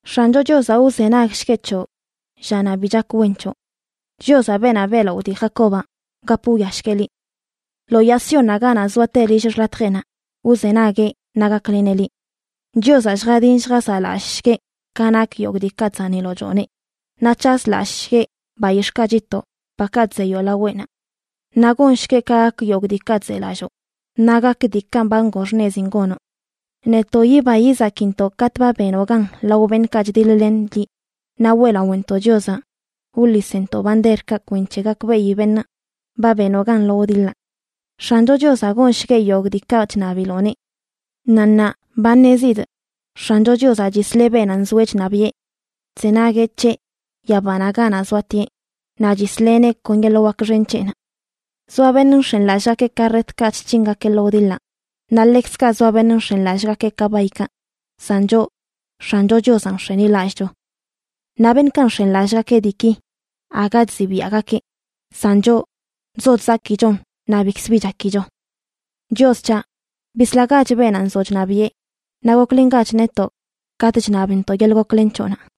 X̱ancho Chiozaꞌ wzenagshgueꞌ c̱hoꞌ llanaꞌ bi chak wen c̱hoꞌ. Chiozaꞌ beenaꞌ beꞌlaꞌo dii Jacobaꞌ, gap wwiashgueꞌ liꞌ. Lo Yaa Siónnaꞌ ganaꞌ zoate lill xḻatjeꞌnaꞌ wzenagueꞌ naꞌ gakleneꞌ liꞌ. Chiozaꞌ lljadin lljazaꞌlallꞌshgueꞌ ka nak yogꞌ diikaꞌ chzaniloꞌ chooneꞌ, naꞌ c̱hazlallꞌshgueꞌ bayix̱ꞌkaꞌ chitoꞌ, bakaꞌ chzeyoꞌ laweꞌnaꞌ. Naꞌ gongshgueꞌ ka gak yogꞌ diikaꞌ chzelalloo, naꞌ gak diikaꞌ ba ngoo xṉezin gonoꞌ. Netoꞌ yiba yizakintoꞌ katꞌ ba benoꞌ gan lao beṉꞌkaꞌ chdiḻ-len liꞌ, naꞌ weꞌlaꞌontoꞌ Chiozaꞌ wḻisntoꞌ banderkaꞌ kwenc̱he gakbeꞌi beṉꞌ ba benoꞌ gan lo wdiḻaꞌ. X̱ancho Chiozaꞌ gonshgueꞌ yogꞌ diikaꞌ chṉabiloꞌneꞌ. Naꞌ ṉaa ba ṉezidꞌ X̱ancho Chiozaꞌ chisleꞌ beenaꞌ nzoeꞌ chṉabiꞌe. Chzenagueꞌ c̱heꞌ yabanaꞌ ganaꞌ zoatieꞌ naꞌ chisleꞌneꞌ kon yeḻꞌ wak xen c̱heꞌnaꞌ. Zoa beṉꞌ nx̱enlallꞌgakeꞌ karretkaꞌ chc̱hingakeꞌ lo wdiḻaꞌ, naꞌ ḻekzkaꞌ zoa beṉꞌ nx̱enlallꞌgakeꞌ kabaykaꞌ, san choꞌ, X̱ancho Chiozanꞌ nx̱enilallꞌcho. Naꞌ beṉꞌkaꞌ nx̱enlallꞌgakeꞌ diiki, aga chzibiaꞌgakeꞌ, san choꞌ, chzo chzakichon naꞌ bikzbi chakicho. Chios c̱haꞌ, bislagach beenaꞌ nzoꞌ chṉabiꞌe, naꞌ goklengach netoꞌ katꞌ chṉabntoꞌ yeḻꞌ goklen c̱hoꞌnaꞌ.